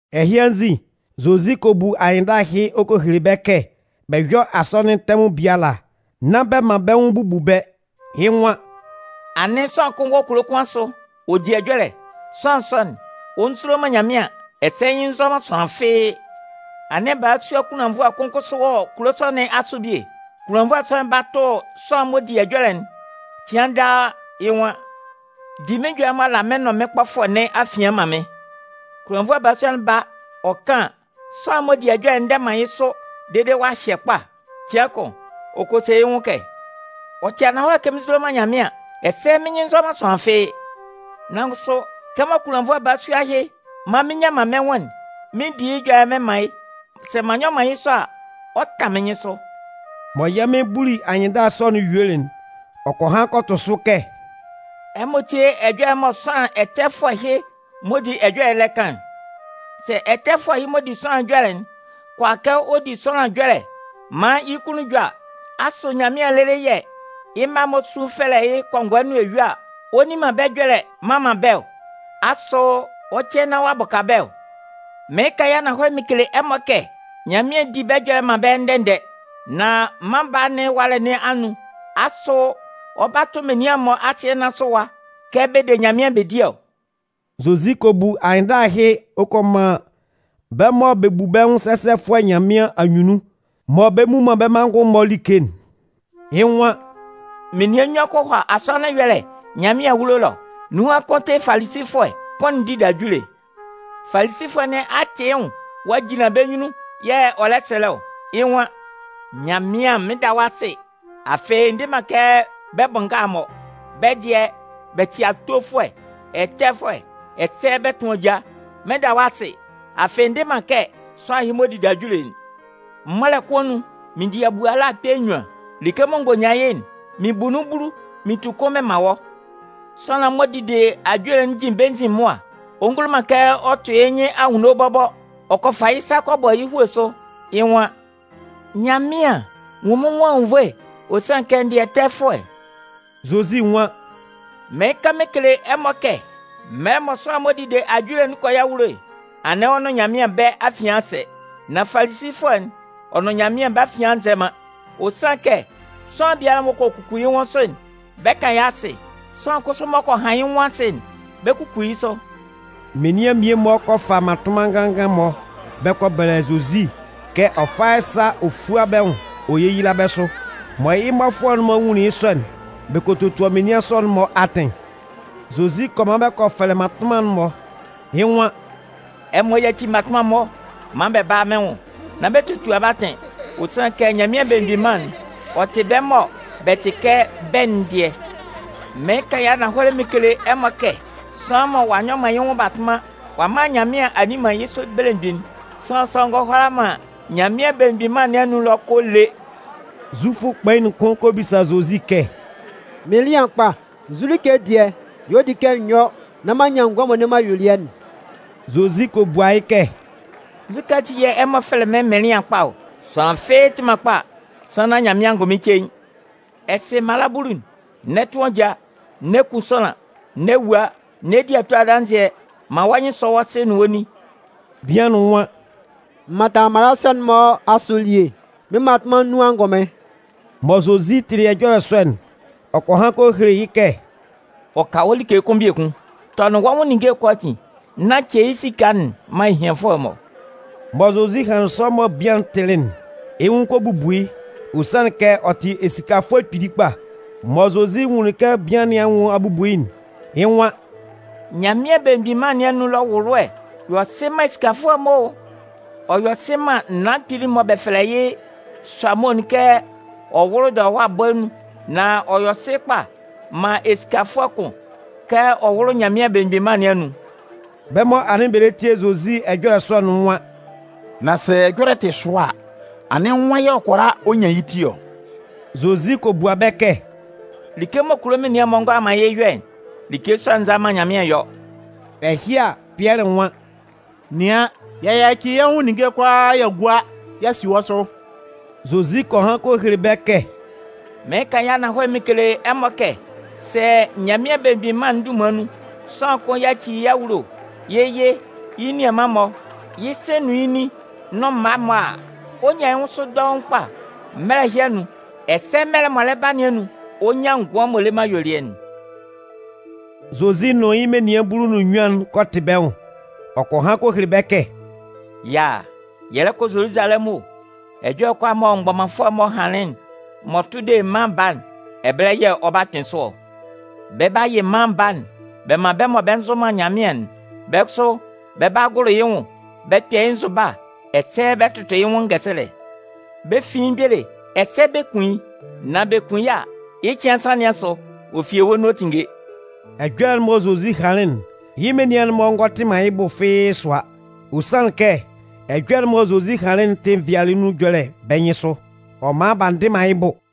Ɛhɩ anzin, Zozi kɔ bu anyɩnndala ɛhɩ ɔ kɔ hele bɛ́ kɛ bɛ yɔ́ asɔnɩn tɛmʋn biala, nán bɛ man bɛ́ nwʋn bubu bɛ́. Yɩ́ nwan: “Anɩn sʋanlan kʋn wɔ kulo kʋn asʋ ɔ di ɛjɔlɛ. Sʋanlan sɔ'n, ɔ nzulo man Nyanmɩan ɛsɛ yɩ́ nyɩn nzɔ man sʋanlan fɩ́ɩ́. Anɩn kunlannvʋɛ balasua kʋn kʋsʋ wɔ kulo sɔ nɩn asʋ bie. Kunlannvʋɛ sɔ'n ba tʋ sʋanlan'n m'ɔ di ɛjɔlɛ'n cɩan daa a, yɩ́ nwan: ‘Di mɩ́n ɛjɔlɛ'n m'ɔ la mɩn nʋn mɩ́n kpɔfʋɛ nɩn afian'n man mɩ́n.’ “Kunlannvʋɛ'n ba ɔ kan an, sʋanlan'n m'ɔ di ɛjɔlɛ'n ndɛ man yɩ́ sʋ dede ɔ'a hyɛ kpa. Cɩan kʋn, ɔ kɔ se yɩ́ nwʋn kɛ: ‘Ɔ tɩ ananhɔlɛ kɛ mɩn nzulo man Nyanmɩan ɛsɛ mɩ́n nyɩn nzɔ man sʋanlan fɩ́ɩ́. Nan kʋsʋ, kɛmɔ kunlannvʋɛ balasua ɛhɩ man mɩn nnyan mɩn nwʋn'n, mɩn 'di yɩ́ ɛjɔlɛ'n mɩn man yɩ́. Sɛ m'an nyɔ man yɩ́ sɔ a, ɔ 'tan mɩ́n nyɩnsʋ.’” Mɔ yɛ́ Mɩn buli anyɩnndala sɔ'n yuelɩ'n, ɔ kɔ han kɔ tʋ sʋ kɛ: “Ɛmɔ tíe ɛjɔlɛ mɔ sʋanlan ɛtɛfʋɛ ɛhɩ m'ɔ di ɛjɔlɛ'n lɛ kan'n! Sɛ ɛtɛfʋɛ ɛhɩ m'ɔ di ɛjɔlɛ'n kʋala kɛ ɔ di sʋanlan ɛjɔlɛ maan yɩ́ kunnun jɔ a, asʋ Nyanmɩan lɩlɩ yɛ̂ yɩ́ mma'n-mɔ sun fɛlɛ yɩ́ kɔngɔɛ nʋn eyue a, ɔ nni man bɛ́ ɛjɔlɛ mman man bɛ́ ɔ? Asʋ ɔ 'cɛ nán ɔ'a bʋka bɛ́ ɔ? Mɩɩn kan yɩ́ ananhɔlɛ mɩn kele ɛmɔ kɛ Nyanmɩan 'di bɛ́ ɛjɔlɛ'n man bɛ́ ndɛ-ndɛ. Nan Mân Baa nɩn ɛwalɛ nun, asʋ ɔ 'ba tʋ menian'n-mɔ asɩɛ nɩn asʋ ɛwa kɛ bɛ de Nyanmɩan bɛ di ɔ?” Zozi kɔ bu anyɩnndala ɛhɩ ɔ kɔ man bɛ́ mɔ bɛ bu bɛ́ nwʋn sɛsɛfʋɛ Nyanmɩan anyunnun, mɔ bɛ mmu man bɛ́ manngʋn-mɔ like'n. Yɩ́ nwan: “Menian nnyuan kɔ hɔ asɔnɩn ɛyɔlɛ Nyanmɩan awulo ɛlɔ. Nunhan kʋn tɩ Falisifʋɛ, kʋn'n dide ajule. Falisifʋɛ nɩn a tɩ yɩ́ nwʋn ɔ'a jinlan bɛ́ nyunnun yɛ̂ ɔ lɛ sɛlɛ ɔ. Yɩ́ nwan: ‘Nyanmɩan, mɩn 'da wɔ́ asɩ, afɩ n dɩ man kɛ menian bʋ nga'n-mɔ. Bɛ́ dɩɛ, bɛ tɩ awofʋɛ, ɛtɛfʋɛ ɛsɛ bɛ tʋn ajaa. Mɩn 'da wɔ́ asɩ, afɩ n dɩ man kɛ sʋanlan ɛhɩ m'ɔ dide ajule'n. Mɔlɛ kʋn anun, mɩn bua mɩn da kpɛ̂ nnyuan. Like mɔ n gɔ nyan yɩ́'n, mɩn bu nun bulu mɩn tu kʋn mɩn man wɔ́.’ “Sʋanlan'n m'ɔ dide ajule'n jin bɛ́ nzin mʋa, ɔ ngulo man kɛ ɔ tʋ yɩ́ nyɩn anwunno bɔbɔ, ɔ kɔ fa yɩ́ sa kɔ bɔ yɩ́ hue sʋ, yɩ́ nwan: ‘Nyanmɩan, nwun mɩ́n nwʋn anwunnvoe. Ɔ sanlɩn kɛ n dɩ ɛtɛfʋɛ.’” Zozi nwan: “Mɩɩn kan mɩn kele ɛmɔ kɛ mɛlɛ mɔ sʋanlan'n m'ɔ dide ajule'n 'kɔ yɩ́ awulo'n, anɩn ɔ nʋn Nyanmɩan, bɛ́ afian a sɛ. Nan Falisifʋɛ'n, ɔ nʋn Nyanmɩan, bɛ́ afian a nzɛ man. Ɔ sanlɩn kɛ sʋanlan biala m'ɔ kɔ kuku yɩ́ nwʋn sʋ'n, bɛ 'kan yɩ́ asɩ. Sʋanlan kʋsʋ m'ɔ kɔ han yɩ́ nwʋn asɩ'n, bɛ 'kuku yɩ́ sʋ.” Menian mmie-mɔ kɔ fa mmatʋnman nganngan-mɔ bɛ kɔ bɛlɛ Zozi kɛ ɔ fá yɩ́ sa ɔ fúa bɛ́ nwʋn ɔ yéyila bɛ́ sʋ. Mɔ yɩ́ mmɔfʋɛ'n-mɔ nwunlin yɩ́ sɔ'n, bɛ kɔ totua menian sɔ'n-mɔ atɩn. Zozi kɔ man bɛ kɔ fɛlɛ mmatʋnman'n-mɔ. Yɩ́ nwan: “Ɛmɔ yáci mmatʋnman'n-mɔ maan bɛ bála mɩ́n nwʋn! Nán bɛ totua bɛ́ atɩn. Ɔ sanlɩn kɛ Nyanmɩan Belemgbin Mân'n, ɔ tɩ bɛ́ mɔ bɛ tɩ kɛ bɛ́'n dɩɛ. Mɩɩn kan yɩ́ ananhɔlɛ mɩn kele ɛmɔ kɛ sʋanlan mɔ ɔ'a nyɔ man yɩ́ nwʋn batʋnman ɔ'a man Nyanmɩan a nni man yɩ́ sʋ belemgbin'n, sʋanlan sɔ'n ngɔ hʋala man Nyanmɩan Belemgbin Mân nɩn anun ɛlɔ kɔ lé.” Zufʋ kpain'n kʋn kɔ bisa Zozi kɛ: “Mɩnlɩan kpa, nzu like dɩɛ y'ɔ di kɛ mɩn yɔ nán m'an nyan ngʋan m'ɔ le man ayuelɩɛ'n?” Zozi kɔ bua yɩ́ kɛ: “Nzukɛ ati yɛ̂ ɛ fɛlɛ mɩ́n mɩnlɩan kpa ɔ? Sʋanlan fɩ́ɩ́ tɩ man kpa, sannan Nyanmɩan angʋnmɩn cein. Ɛ sɩ mala bulu'n: N'ɛ tʋn ajaa, n'ɛ kun sʋanlan, n'ɛ wua, n'ɛ di ato adanzɩɛ, man wɔ́ nyɩn sɔ́ wɔ́ sɩ nʋn wɔ́ nin.” Bian'n nwan: “M mantanlɩn mala sɔ'n-mɔ asʋ elie mɩ́n mmatʋnman nun angʋnmɩn.” Mɔ Zozi tɩlɩ ɛjɔlɛ sɔ'n, ɔ kɔ han kɔ hele yɩ́ kɛ: “Ɔ ka wɔ́ like kʋn biekun. Tɔnɩn wɔ́ nwʋn ninnge'n kʋalaatin nán ce yɩ́ esika'n man ehianfʋɛ'n-mɔ.” Mɔ Zozi hanlɩn sɔ mɔ bian'n tɩlɩ'n, yɩ́ nwʋn kɔ bubu yɩ́. Ɔ sanlɩn kɛ ɔ tɩ esikafʋɛ kpili kpa. Mɔ Zozi nwunlin kɛ bian nɩn anwʋn a bubu yɩ́'n, yɩ́ nwan: “Nyanmɩan Belemgbin Mân nɩn anun ɛlɔ ɛwʋlʋɛ'n yɔ sɩ man esikafʋɛ'n-mɔ o! Ɔ yɔ sɩ man naan kpili'n mɔ bɛ fɛlɛ yɩ́ sʋamo'n kɛ ɔ wʋ́lʋ dɔlɔwa bɔɛ nun. Nan ɔ yɔ sɩ kpa man esikafʋɛ kʋn kɛ ɔ wʋ́lʋ Nyanmɩan Belemgbin Mân nɩn anun.” Bɛ́ mɔ anɩn bɛ lɛ tie Zozi ɛjɔlɛ sɔ'n nwan: “Nan sɛ ɛjɔlɛ'n tɩ sʋa a, anɩn nwan yɛ̂ ɔ kʋala ɔ nyan yɩ́ ti ɔ?” Zozi kɔ bua bɛ́ kɛ: “Like mɔ kulo menian'n-mɔ ngʋala man yɩ́ yɔ'n, like sɔ'n nza man Nyanmɩan yɔ.” Ɛhɩ a, Pɩɛlɩ nwan: “Nɩan, y'a yaci yɛ́ nwʋn ninnge'n kʋalaa y'a gua y'a si wɔ́ sʋ.” Zozi kɔ han kɔ hele bɛ́ kɛ: “Mɩɩn kan yɩ́ ananhɔlɛ mɩn kele ɛmɔ kɛ sɛ Nyanmɩan Belemgbin Mân'n dunman nun, sʋanlan kʋn yaci yɩ́ awulo, yɩ́ yɩ, yɩ́ nianman-mɔ, yɩ́ sɩ nʋn nʋn yɩ́ nin nʋn mma-mɔ a, ɔ 'nyan yɩ́ nwʋn sʋ dɔʋn kpa mɛlɛ ɛhɩ anun. Ɛsɛ mɛlɛ'n m'ɔ lɛ ba nɩn anun, ɔ 'nyan ngʋan m'ɔ le man ayuelɩɛ'n.” Zozi nʋn yɩ́ menian bulu nʋn nnyuan'n kɔ tɩ bɛ́ nwʋn. Ɔ kɔ han hɔ hele bɛ́ kɛ: “Yaa, yɛ lɛ kɔ Zoluzalɛmʋn o! Ɛjɔlɛ'n kʋalaa mɔ mgbɔmanfʋɛ'n-mɔ hanlɩn m'ɔ tʋ de Mân Baa'n, ɛbɛlɛ yɛ̂ ɔ 'kpɩn sʋ ɔ. Bɛ 'ba yɩ Mân Baa'n bɛ man bɛ́ mɔ bɛ nzʋ man Nyanmɩan'n. Bɛ́ kʋsʋ bɛ 'ba gʋlʋ yɩ́ nwʋn, bɛ 'kpɛ yɩ́ nzʋba ɛsɛ bɛ 'tʋtʋ yɩ́ nwʋn ngɛsɛlɛ. Bɛ 'fin yɩ́ mgbele ɛsɛ bɛ 'kun yɩ́. Nan bɛ kun yɩ́ a, yɩ́ cɩan nsan nɩn asʋ, ɔ fi ewue nun ɔ 'tinnge.” Ɛjɔlɛ'n mɔ Zozi hanlɩn'n, yɩ́ menian'n-mɔ ngɔ tɩ man yɩ́ bʋ fɩ́ɩ́ sʋa. Ɔ sanlɩn kɛ ɛjɔlɛ'n mɔ Zozi hanlɩn'n tɩ nvɩalɩɛ nun ɛjɔlɛ bɛ́ nyɩnsʋ. Ɔ man b'a ndɩ man yɩ́ bʋ.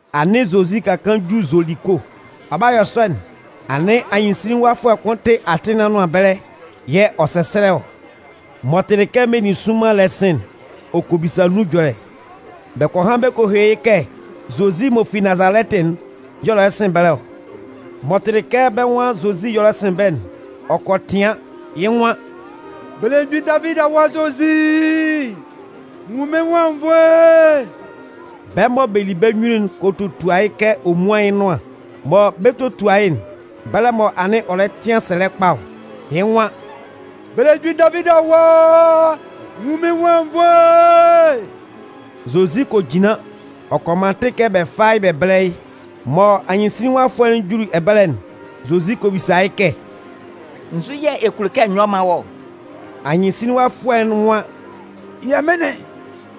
Anɩn Zozi ka kaan ju Zoliko. Ɔ 'ba yɔ sɔ'n, anɩn anyɩnsinlinwafʋɛ kʋn tɩ atɩn nɩn anʋan ɛbɛlɛ yɛ̂ ɔ sɛsɛlɛ ɔ. M'ɔ tɩlɩ kɛ meninsʋnman lɛ sɩ̂n'n, ɔ kɔ bisa nun ɛjɔlɛ. Bɛ kɔ han bɛ kɔ hele yɩ́ kɛ Zozi m'ɔ fi Nazalɛtɩ'n y'ɔ lɛ sɩn ɛbɛlɛ ɔ. M'ɔ tɩlɩ kɛ bɛ́ nwan Zozi y'ɔ lɛ sɩn ɛbɛlɛ'n, ɔ kɔ tɩan. Yɩ́ nwan: “Belemgbin Davidi Awa Zozi, nwun mɩ́n nwʋn anwunnvoe!” Bɛ́ mɔ bɛ li bɛ́ nyunnun'n kɔ totua yɩ́ kɛ ɔ múan yɩ́ nʋan. Mɔ bɛ 'totua yɩ́'n, bɛlɛ mɔ anɩn ɔ lɛ tɩan sɛlɛ kpa ɔ. Yɩ́ nwan: “Belemgbin Davidi Awa, nwun mɩ́n nwʋn anwunnvoe!” Zozi kɔ jinlan ɔ kɔ man atɩn kɛ bɛ fá yɩ́ bɛ bɛ́lɛ yɩ́. Mɔ anyɩnsinlinwafʋɛ'n juli ɛbɛlɛ'n, Zozi kɔ bisa yɩ́ kɛ: “Nzu yɛ̂ ɛ kulo kɛ n yɔ́ m mán wɔ́ ɔ?” Anyɩnsinlinwafʋɛ'n nwan: “Yɛmɩnlɩn,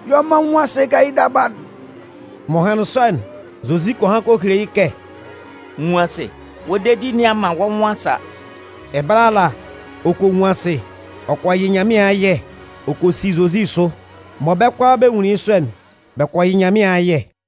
yɔ maan n nwún asɩ kɛ yɩ́ daba'n.” M'ɔ hanlɩn sɔ'n, Zozi kɔ han kɔ hele yɩ́ kɛ: “Nwun asɩ! Wɔ́ dedi nɩn a man wɔ́ nwʋn a sa.” Ɛbɛlɛ ala, ɔ kɔ nwun asɩ. Ɔ kɔ yɩ Nyanmɩan ayɛ ɔ kɔ si Zozi sʋ. Mɔ bɛ́ kʋalaa bɛ nwunlin yɩ́ sɔ'n, bɛ kɔ yɩ Nyanmɩan ayɛ.